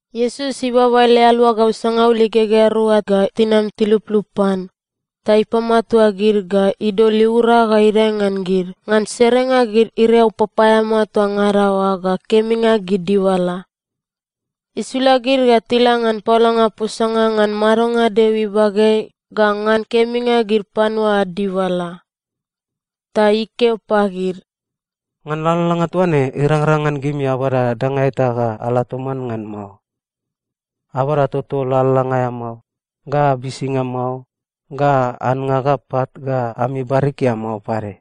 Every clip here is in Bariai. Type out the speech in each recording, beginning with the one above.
Iesus ibaba ele aluagau sangaul igegea rua ga tinam tiluplup pan, ta ipamatua gid ga idol iura ga idae ngan gid ngan serenga gid iriau papaeamao toa ngada oa ga keminga gid dibala. Isula gid ga tila ngan paolanga posanga ngan madonga Deo ibageai ga ngan keminga gid panua ad dibala. Ta ikeo pagid, “Ngan lalalanga toa ne, irangrang ngan gimi abada danga eta ga ala toman ngan mao. Abada toto lalalanga aea mao, ga bisinga mao, ga annga ga pat ga ami barikia mao pade.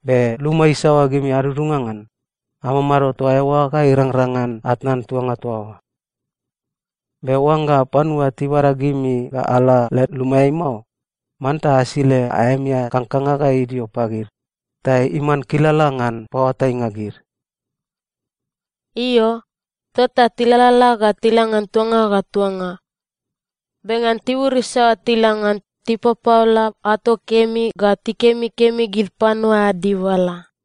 Be luma isaoa gimi adudunga ngan, amamado toa eoa ga irangrang ngan atnan tuanga toa oa. Be oangga panua tibada gimi ga ala led lumaeai mao, manta asile aemi aea kangkanga ga idio pagid, ta iman kilala ngan paoatainga gid.” Io, tota tilalala ga tila ngan tuanga ga tuanga. Be ngan tibur isaoa tila ngan, tipapaola ato kemi ga tikemikemi gid panua ad dibala.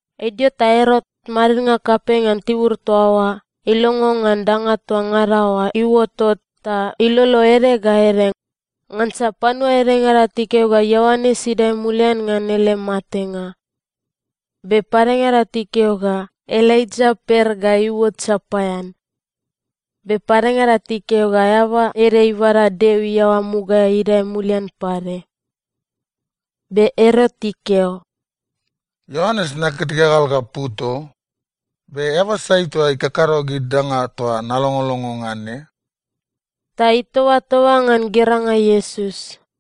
Idio ta Erot, madidnga kapei ngan tibur toa oa, ilongo ngan danga toa ngada oa iuotot ta ilolo ede ga ede, ngansa panua edengada tikeo ga Ioanes idae mulian ngan ele matenga. Be padengada tikeo ga Elaija per ga iuot sapaean. Be padengada tikeo ga eaba ede ibada Deo iaoa mugaeai idae mulian pade. Be Erot ikeo, “Ioanes, naket igagal ga put o. Be eaba sai toa ikakado gid danga toa nalongolongo ngan ne?” Ta itobatoba ngan geranga Iesus.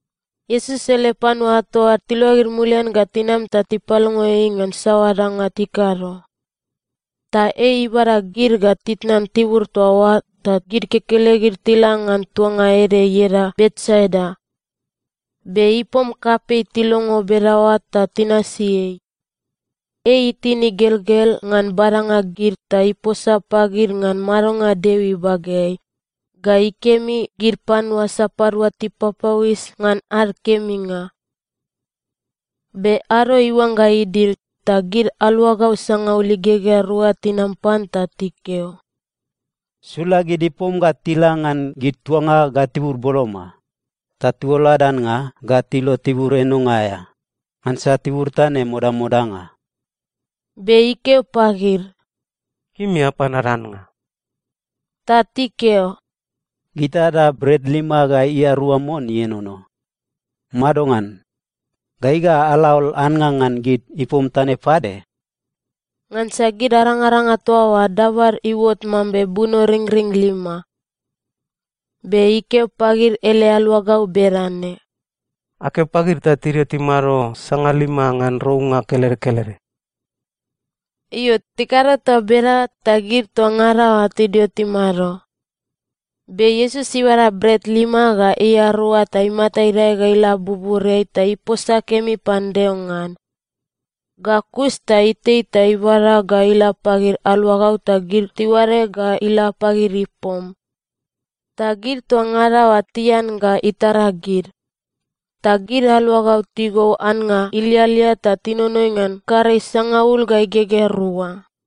Iesus ele panua ato ad tiluagid mulian ga tinam ta tipalongo ei ngan saoa danga tikado. Ta ei ibada gid ga titnan tibur toa oa ta gid kekelegid tila ngan tuanga ede ieda Betsaida. Be ipom kapei tilongo bedaoa ta tinasi ei. Ei itin igelgel ngan badanga gid ta iposa pagid ngan madonga Deo ibageai, ga ikemi gid panua sapadua tipapauis ngan ad keminga. Be ado iuangga idil, ta gid aluagau sangaul igegea rua tinam pan ta tikeo, “Sula gid ipom ga tila ngan gid tuanga ga tibur boloma, ta tiuol ad annga ga tilo tibur enonga aea. Ngansa tibur toa ne modamodanga.” Be ikeo pagid, “Gimi apan ad annga.” Ta tikeo, “Gita ada bret lima ga ia rua mon ienono. Madongan? Gai ga ala aol annga ngan gid ipom toa ne pade?” (Ngansa gid arangaranga toa oa dabad iuot mambe bunoringring lima.) Be ikeo pagid ele aluagau bedane, “Akeo pagid ta tidio timado sangalima ngan rounga kelede kelede.” Io, tikado toa bedaoa, ta gid toa ngada oa tidio timado. Be Iesus ibada bret lima ga ia rua ta imata idae ga ila buburiai ta iposa kemi pan Deo ngan. Ga kus ta itei ta ibada ga ila pagid aluagau ta gid tiuade ga ila pagid ipom. Ta gid toa ngada oa tian ga itara gid, ta gid aluagau tigou annga ilialia ta tinonoi ngan karei sangaul ga igegea rua.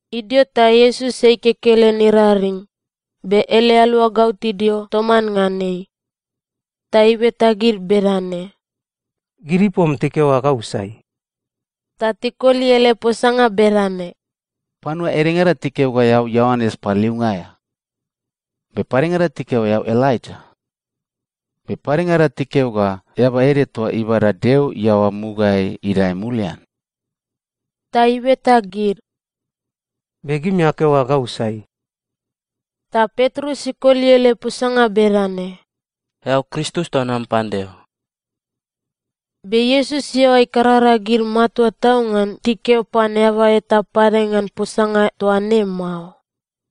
Idio ta Iesus ei kekelen iraring, be ele aluagau tidio toman ngan ei. Ta ibeta gid bedane, “Gid ipom tikeo ga gau sai?” Ta tikoli ele posanga bedane, “Panua edengada tikeo ga eao Ioanes Paliliunga aea, be padengada tikeo ga eao Elaija, be padengada tikeo ga eaba ede toa ibada Deo iaoa mugaeai idae mulian.” Ta ibeta gid, “Be gimi akeo ga gau sai?” Ta Petrus ikoli ele posanga bedane, “Eao Kristus toa nam pan Deo.” Be Iesus iaoa ikarara gid matua tau ngan tikeo pan eaba eta pade ngan posanga toa ne mao.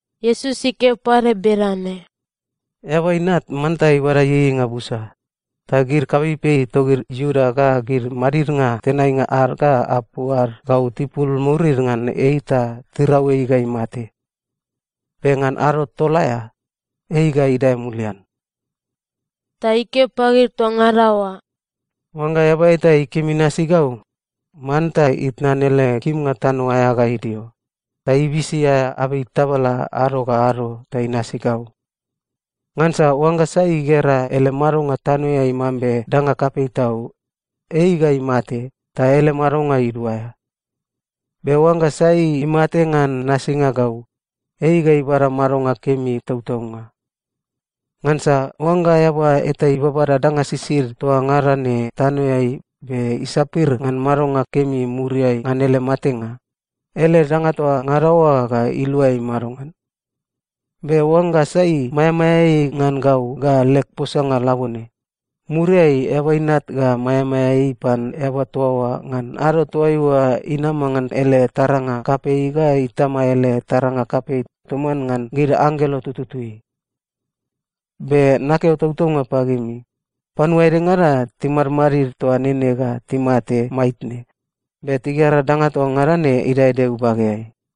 Iesus ikeo pade bedane, “Eaba Inat manta ibada ieieinga busa, ta gid kapeipei togid Iuda ga gid madidnga tenainga ad ga apu ad gau tipul murid ngan ei ta tirau ei ga imate. Be ngan ado tol aea, ei ga idae mulian.” Ta ikeo pagid toa ngada oa, “Oangga eaba eta ikim inasi gau, manta itnan ele kimnga tano aea ga idio, ta ibisi aea abei tabala ado ga ado ta inasi gau. Ngansa oangga sai igera ele madonga tanoeai mambe danga kapei tau, ei ga imate ta ele madonga iduaea. Be oangga sai imate ngan nasinga gau, ei ga ibada madonga kemi tautaunga. Ngansa oangga eaba eta ibabada danga sisid toa ngada ne tanoeai be isapir ngan madonga kemi muriai ngan ele matenga, ele danga toa ngada oa ga ilua ei madongan? Be oangga sai maeamaea ei ngan gau ga leg posanga labone, muriai Eaba Inat ga maeamaea ei pan eaba toa oa ngan ado toaiua inama ngan ele taranga kapei ga Itama ele taranga kapei toman ngan gid anggelo tututui. Be nakeo tautaunga pagimi, panua edengada timadmadid toa nene ga timate maitne, be tigera danga toa ngada ne idae Deo ibageai.”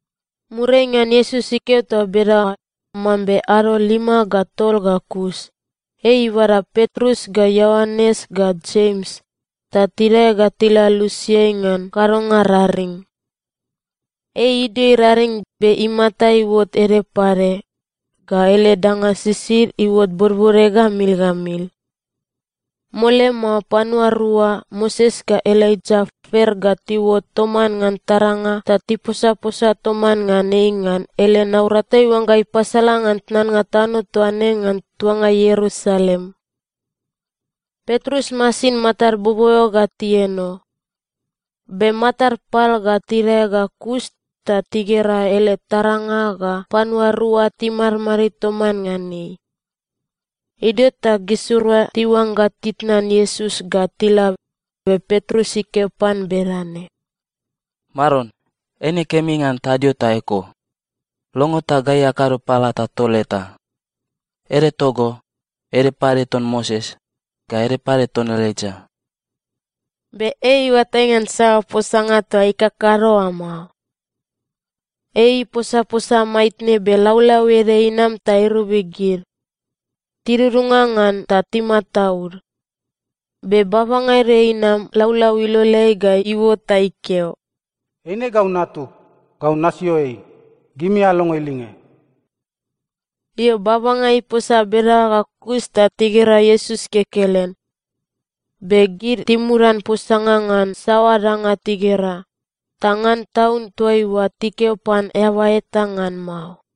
Muriai ngan Iesus ikeo toa bedaoa, mambe ado lima ga tol ga kus, ei ibada Petrus ga Ioanes ga Jems, ta tidae ga tila lusiai ngan kadonga raring. Ei idio iraring, be imata iuot ede pade, ga ele danga sisid iuot bodbode ga mil ga mil. Mole mao, panua rua, Moses ga Elaija, per ga tiuot toman ngan taranga ta tiposaposa toman ngan ei ngan ele naurata iuangga ipasala ngan tnannga tano toa ne ngan tuanga Ierusalem. Petrus masin matad boboeo ga tieno. Be matad pal ga tidae ga kus, ta tigera ele taranga ga panua rua timadmadid toman ngan ei. Idio ta gisirua tiuangga titnan Iesus ga tila, be Petrus ikeo pan bedane, “Maron, eine kemi ngan tadio toa eko. Longo ta gai akado palata tol eta. Ede togo, ede pade ton Moses, ga ede pade ton Elaija.” (Be ei iuatai ngan saoa posanga toa ikakado oa mao.) Ei iposaposa maitne, be laulau ede inam ta irobi gid. Tidudunga ngan ta timataud. Be babanga ede inam laulau iloleai ga iuot ta ikeo, “Eine gau Natug. Gau nasio ei. Gimi alongo ilinge!” Io, babanga iposa bedaoa ga kus, ta tigera Iesus kekelen. Be gid timudan posanga ngan saoa danga tigera, ta ngan taun toaiua tikeo pan eaba eta ngan mao.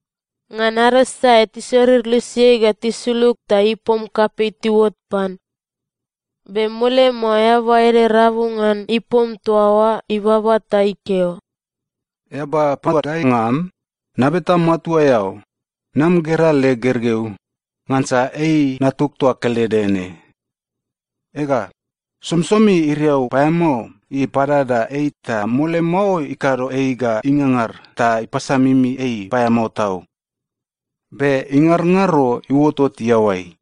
Ngan ado sae tisorir lusiai ga tisulug, ta ipom kapei tiuot pan. Be mole mao, eaba ede rabu ngan ipom toa oa ibaba ta ikeo, “Eaba paoatainga am, nabeta matua eao, nam gera leg gergeu, ngansa ei natug toa kelede ne. Ega, somisomi iriau paeamao ipadada ei ta mole mao ikado ei ga ingangar ta ipasamimi ei paeamao tau. Be ingarongaro iuotot iaoai.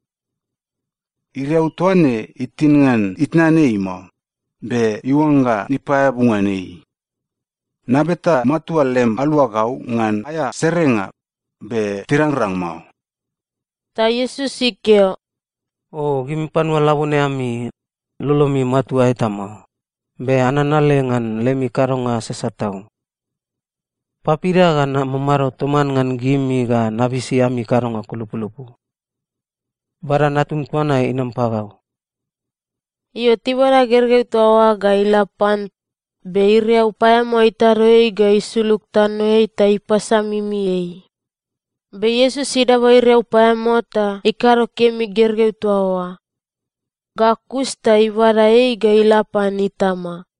Iriau toa ne itin ngan itnan ei mao, be iuangga ipaeabu ngan ei. Nabeta matua lem aluagau ngan aea serenga, be tirangrang mao.” Ta Iesus ikeo, “O gimi panua labone ami! Lolomi matua eta mao, be ananale ngan lemi kadonga sasat tau. Papida ga namamado toman ngan gimi ga nabisi ami kadonga kulupulupu? Bada natum toa na inam pagau.” Io, tibada gergeu toa oa ga ila pan, be iriau paeamao itado ei ga isulug tanoeai ta ipasamimi ei. Be Iesus idaba iriau paeamao ta ikado kemi gergeu toa oa. Ga kus ta ibada ei ga ila pan itama.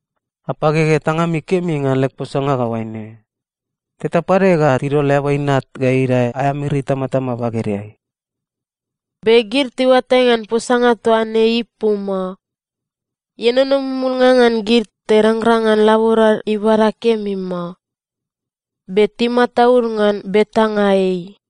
“Apagege tangami kemi ngan leg posanga ga oaine: Teta pade ga tidol Eaba Inat ga idae aea miri itamatama bagedeai.” Be gid tiuatai ngan posanga toa ne ipu mao. Ienono mumulnga ngan gid, ta irangrang ngan laborad ibada kemi mao. Be timataud ngan betanga ei.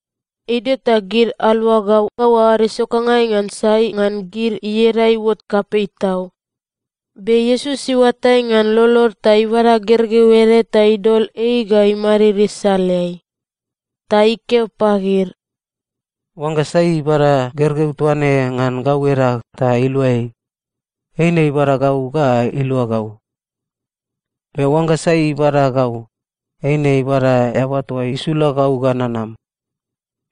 Idio ta gid aluagau aoad isokangai ngan sai ngan gid ieda iuot kapei tau. Be Iesus iuatai ngan lolod ta ibada gergeu ede ta idol ei ga imadid isaleai. Ta ikeo pagid, “Oangga sai ibada gergeu toa ne ngan gau edag ta ilua ei, eine ibada gau ga ilua gau. Be oangga sai ibada gau, eine ibada Eaba toa isula gau ga nanam.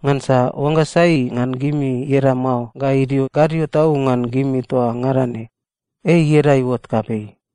Ngansa oangga sai ngan gimi ieda mao ga idio gadio tau ngan gimi toa ngada ne, ei ieda iuot kapei.”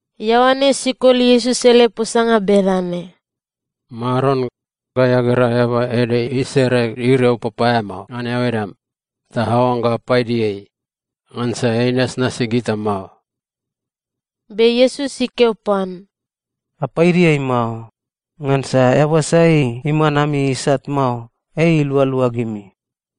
Ioanes ikoli Iesus ele posanga bedane, “Maron, gai agera eaba ede isere iriau papaeamao ngan eao edam, ta aoangga apaidi ei, ngansa ei inasnasi gita mao.” Be Iesus ikeo pan, “Apaidi ei mao, ngansa eaba sai iman ami isat mao, ei ilualua gimi.”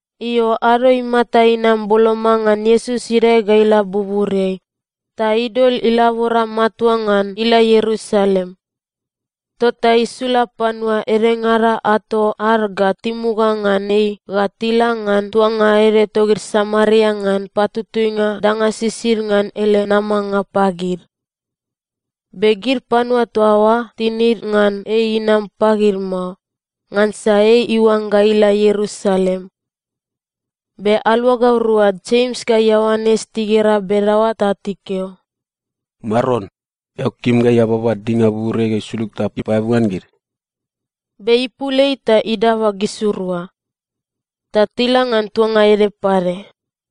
Io, ado imata inam boloma ngan Iesus idae ga ila buburiai, ta idol ilabora matua ngan ila Ierusalem. Tota isula panua edengada ato ad ga timuga ngan ei ga tila ngan tuanga ede togid Samaria ngan patutuinga danga sisid ngan ele namanga pagid. Be gid panua toa oa tinid ngan ei inam pagid mao, ngansa ei iuangga ila Ierusalem. Be aluagau rua Jems ga Ioanes tigera bedaoa ta tikeo, “Maron, eao kim gai ababa dinga buburiai ga isulug ta ipaeabu ngan gid?” Be ipul ei ta idaba gisirua. Ta tila ngan tuanga ede pade.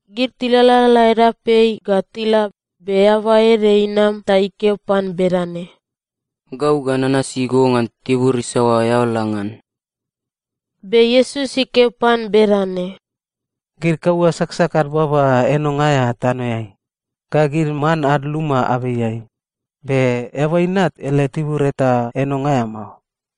Gid tilalala edapeai ga tila, be eaba ede inam ta ikeo pan bedane, “Gau ga nanasi go ngan tibur isaoa eao la ngan.” Be Iesus ikeo pan bedane, “Gid kaua saksak ad baba enonga aea tanoeai, ga gid man ad luma abeiai, be Eaba Inat ele tibur eta enonga aea mao.”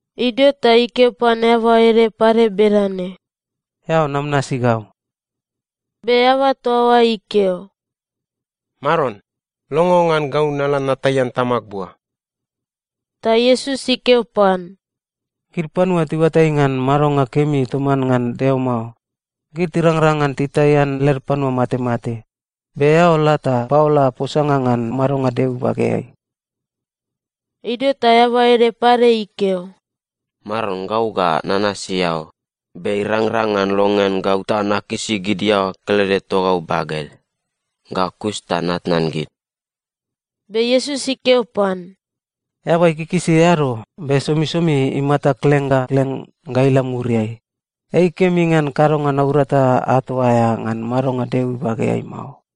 Idio ta ikeo pan eaba ede pade bedane, “Eao nam nasi gau.” Be eaba toa oa ikeo, “Maron, longo ngan gau nala nataian tamag bua.” Ta Iesus ikeo pan, “Gid panua tiuatai ngan madonga kemi toman ngan Deo mao, gid tirangrang ngan titaian led panua matemate, be eao la ta paola posanga ngan madonga Deo ibageai.” Idio ta eaba ede pade ikeo, “Maron, gau ga nanasi eao, be irangrang ngan longean gau ta nakisi gid iaoa kelede togau baged, ga kus ta natnan gid?” Be Iesus ikeo pan, “Eaba ikikisi eado, be somisomi imata kleng ga kleng ga ila muriai, ei kemi ngan kadonga naurata ato aea ngan madonga Deo ibageai mao.”